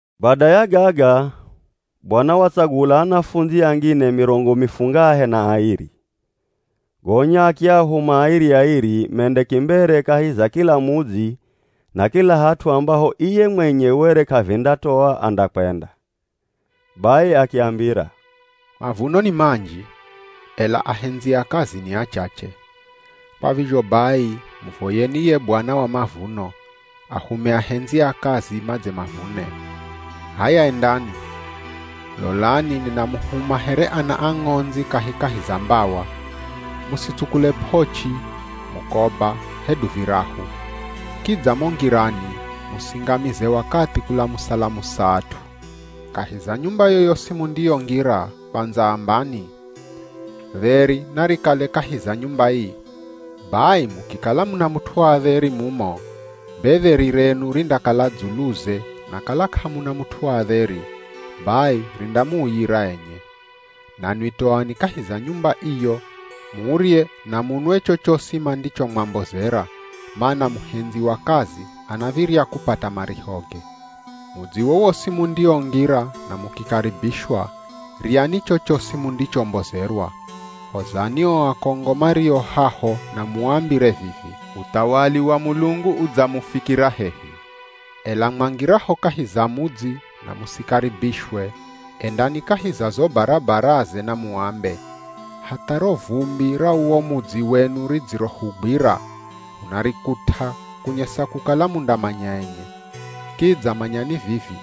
Bada ya gaga, Bwana watsagula anafundzi angine mirongo mifungahe na airi. Gonya akiahuma airi-airi mende kimbere kahi za kila mudzi na kila hat'u ambaho iye mwenye were k'avindatoa andakwenda. Bai akiambira, “Mavuno ni manji, ela ahendzi a kazi ni achache. Kwa vizho bai muvoyeni ye Bwana wa mavuno, ahume ahendzi a kazi madze mavune. H'aya, endani! Lolani ninamuhuma here ana a ng'ondzi kahikahi za mbawa. Musitsukule p'ochi, mukoba, hedu virahu. Kidza mo ngirani musingamize wakathi kulamusa-lamusa at'u. “Kahi za nyumba yoyosi mundiyongira kwandza ambani, ‘Dheri narikale kahi za nyumba ii.’ Bai mukikala muna mut'u wa dheri mumo, be dheri renu rindakala dzuluze na kala k'amuna mut'u wa dheri, bai rindamuuyira enye. Nanwi toani kahi za nyumba iyo murye na munwe chochosi mandichomwambozera, mana muhendzi wa kazi anav̱irya kupata marihoge. Mudzi wowosi mundiongira na mukikaribishwa, ryani chochosi mundichombozerwa. Hozani o akongo mario haho na muambire vivi, ‘Uthawali wa Mulungu udzamufikira hehi.’ Ela mwangiraho kahi za mudzi na musikaribishwe endani kahi za zo barabaraze na muambe, ‘Hatha ro vumbi ra uwo mudzi wenu ridzirohugwira, hunarikut'a kunyesa kukala mundamanya enye; kidza manyani vivi,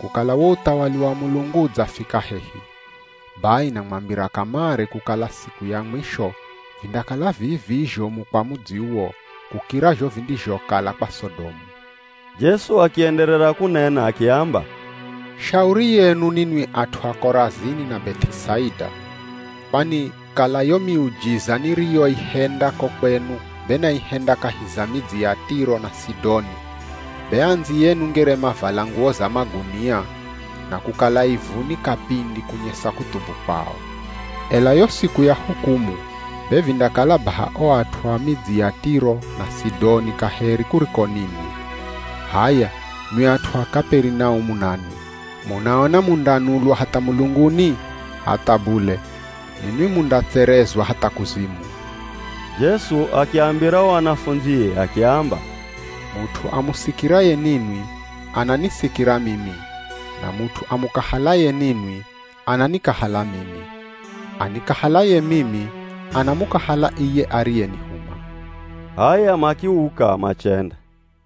kukala wo uthawali wa Mulungu udzafika hehi.’ Bai namwambira kamare kukala siku ya mwisho vindakala vii-vii zhomu kwa mudzi uwo, kukira zho vindizhokala kwa Sodomu.” Jesu akienderera kunena akiamba, “Shauri yenu ninwi at'u a Korazini na Beth'isaida. Kwani kala yo miujiza niriyoihenda ko kwenu be naihenda kahi za midzi ya Tiro na Sidoni be andziyenu ngere mavala nguwo za magunia, na kukala ivuni kapindi kunyesa kuthubu kwao. Ela yo siku ya hukumu be vindakala baha o at'u a midzi ya Tiro na Sidoni kaheri kuriko ninwi. H'aya, nwi at'u a Kaperinaumu nanwi, munaona mundanulwa hatha mulunguni? Hatha bule, ninwi mundatserezwa hatha kuzimu.” Jesu akiambira o anafundzie akiamba, “Mut'u amusikiraye ninwi, ananisikira mimi, na mut'u amukahalaye ninwi, ananikahala mimi. Anikahalaye mimi, anamukahala iye ariyenihuma.” H'aya makiuka machenda.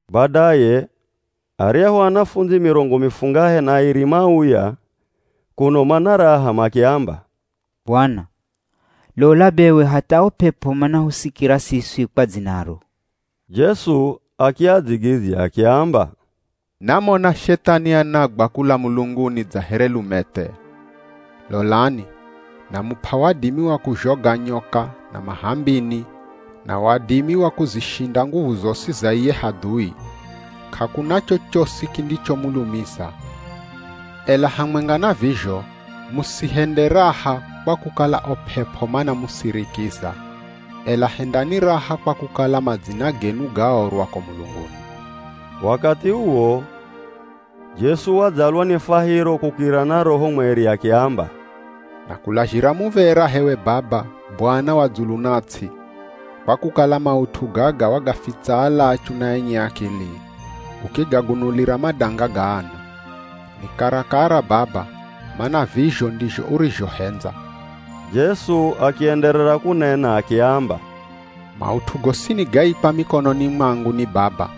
Badaye aryahu anafundzi mirongo mifungahe na airi mauya kuno mana raha makiamba, “Bwana, lola bewe hatha o p'ep'o manahusikira siswi kwa dzinaro.” Jesu akiadzigidzya akiamba, “Namona Shethani anagwa kula mulunguni dza here lumethe. Lolani, namup'a wadimi wa kuzhoga nyoka na mah'ambini na wadimi wa kuzishinda nguvu zosi za iye hadhui. K'akuna chochosi kindichomulumiza. Ela hamwenga na vizho musihende raha kwa kukala o p'ep'o manamusirikira, ela hendani raha kwa kukala madzina genu gaorwa ko mulunguni.” Wakathi uwo Jesu wadzalwa ni fwahiro kukirira na Roho Mweri akiamba, “Nakulazhira muv̱era h'ewe Baba, Bwana wa dzulu na ts'i, kwa kukala maut'u gaga wagafitsa alachu na enye akili, ukigagunulira madanga ga ana. Ni karakara Baba, mana vizho ndizho urizhohendza.” Jesu akienderera kunena akiamba, “Maut'u gosini gaikwa mikononi mwangu ni Baba.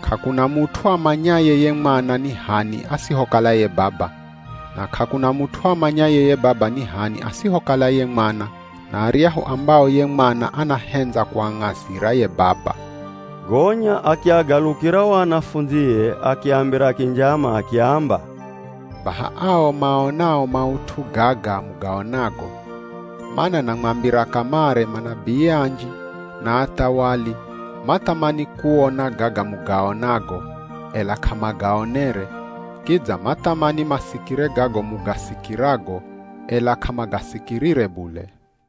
K'akuna mut'u amanyaye ye Mwana ni h'ani asihokala ye Baba, na k'akuna mut'u amanyaye ye Baba ni h'ani asihokala ye Mwana na aryahu ambao ye Mwana anahendza kuang'azira ye Baba.” Gonya akiagalukira o anafundzie akiambira kinjama akiamba, “Baha ao maonao maut'u gaga mugaonago. Mana namwambira kamare manabii anji na athawali mathamani kuona gaga mugaonago, ela k'amagaonere, kidza mathamani masikire gago mugasikirago ela k'amagasikirire bule.”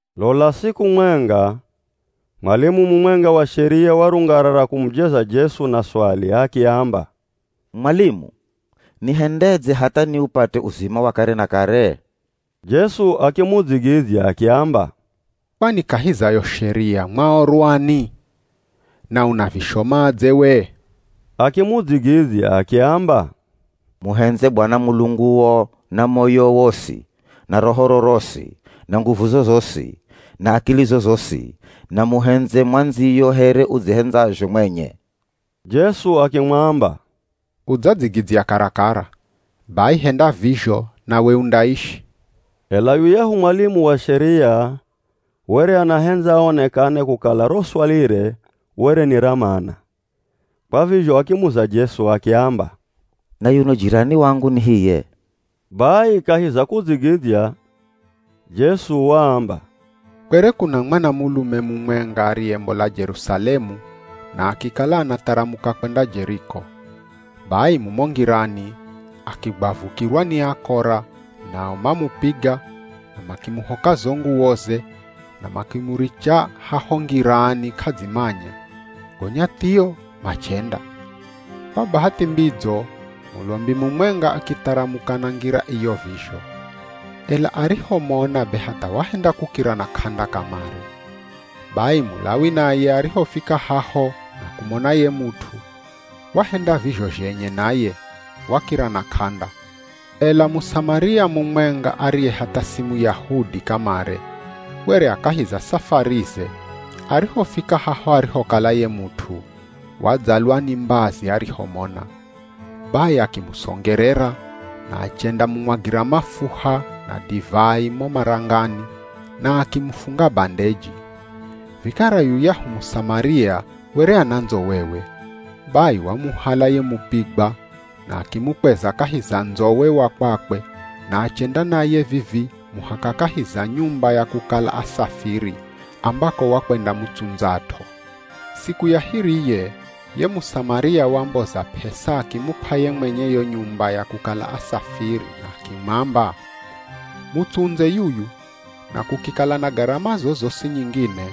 Lola siku mwenga, mwalimu mumwenga wa Sheria warungarara kumujeza Jesu na swali akiamba, “Mwalimu, nihendedze hatha niupate uzima wa kare na kare?” Jesu akimudzigidzya akiamba, “Kwani kahi za yo Sheria, mwaorwani? Na unavishomadze we?” Akimudzigidzya akiamba, “ ‘Muhendze Bwana Mulunguo na moyowo wosi, na rohoro rosi, na nguvuzo zosi, na akilizo zosi,’ na ‘Muhendze mwandziyo here udzihendzazho mwenye.’” Jesu akimwamba, “Udzadzigidzya karakara, bai henda vizho nawe undaishi.” Ela yuyahu mwalimu wa Sheria were anahendza aonekane kukala ro swalire were ni ra mana, kwa vizho akimuza Jesu akiamba, “Na yuno jirani wangu ni hiye?” Bai kahi za kudzigidzya, Jesu waamba, “Kwere kuna mwanamulume mumwenga ariyembola Jerusalemu na akikala anatharamuka kwenda Jeriko. Bai mumo ngirani akigwavukirwa ni akora nao mamupiga na makimuhoka zo nguwoze na makimuricha haho ngirani k'adzimanya, gonya thio, machenda. Kwa bahathi mbidzo mulombi mumwenga akitharamuka na ngira iyo vizho, ela arihomona be hatha wahenda kukira na k'anda kamare. Bai Mulawi naye arihofika haho na kumona ye mut'u, wahenda vizho zhenye naye, wakira na k'anda. Ela Musamaria mumwenga ariye hatha si Muyahudi kamare were a kahi za safarize arihofika haho arihokala ye mut'u, wadzalwa ni mbazi arihomona. Bai akimusongerera na achendamumwagira mafuha na divai mo marangani na akimufunga bandeji. Vikara yuyahu Musamaria were ana ndzowewe, bai wamuhala ye mupigwa na akimukweza kahi za ndzowe wa kwakwe na achenda naye vivii muhaka kahi za nyumba ya kukala asafiri ambako wakwendamutsundzat'o. Siku ya hiriye ye Musamaria wamboza p'esa akimup'a ye mwenye yo nyumba ya kukala asafiri na akimwamba, ‘Mutsundze yuyu, na kukikala na garama zozosi nyingine,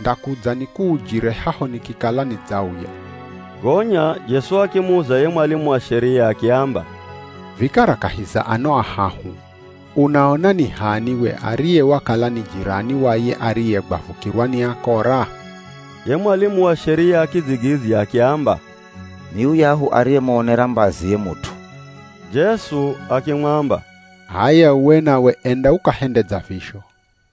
ndakudza nikuujire haho nikikala nidzauya.’” Gonya Jesu akimuza ye mwalimu wa Sheria akiamba, “Vikara kahi za ano ahahu, unaona ni h'ani we ariye wakala ni jirani wa ye ariyegwavukirwa ni akora?” Ye mwalimu wa Sheria akidzigidzya akiamba, “Ni yuyahu ariyemuonera mbazi ye mut'u.” Jesu akimwamba, “H'aya uwe nawe enda ukahende dza vizho.”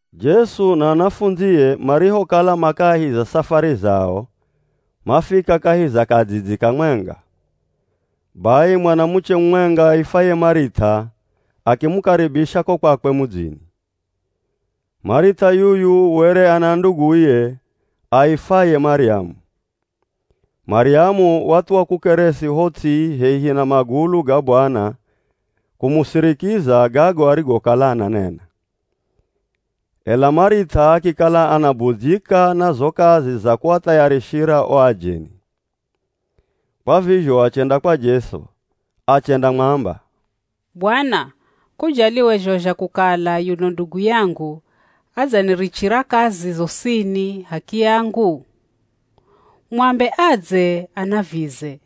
Jesu na anafundzie marihokala ma kahi za safari zao, mafika kahi za kadzidzi kamwenga, bai mwanamuche mumwenga aifwaye Marith'a akimukaribisha ko kwakwe mudzini. Marith'a yuyu were ana nduguye aifwaye Maryamu. Maryamu wathuwa kukeresi ho ts'i hehi na magulu ga Bwana kumusirikiza gago arigokala ananena. Ela Marith'a akikala anabudzyika na zo kazi za kuathayarishira o ajeni. Kwa vizho achenda kwa Jesu, achendamwamba, “Bwana, k'ujali we zho zha kukala yuno ndugu yangu adzanirichira kazi zosini h'akiyangu? Mwambe adze anavize!”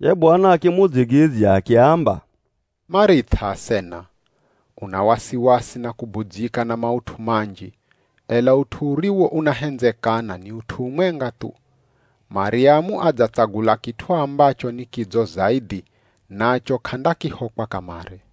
Ye Bwana akimudzigidzya akiamba, “Marith'a asena, una wasiwasi na kubudzyika na maut'u manji, ela ut'u uriwo unahendzekana ni ut'u umwenga thu, Maryamu adzatsagula kit'u ambacho ni kidzo zaidhi nacho k'andakihokwa kamare.”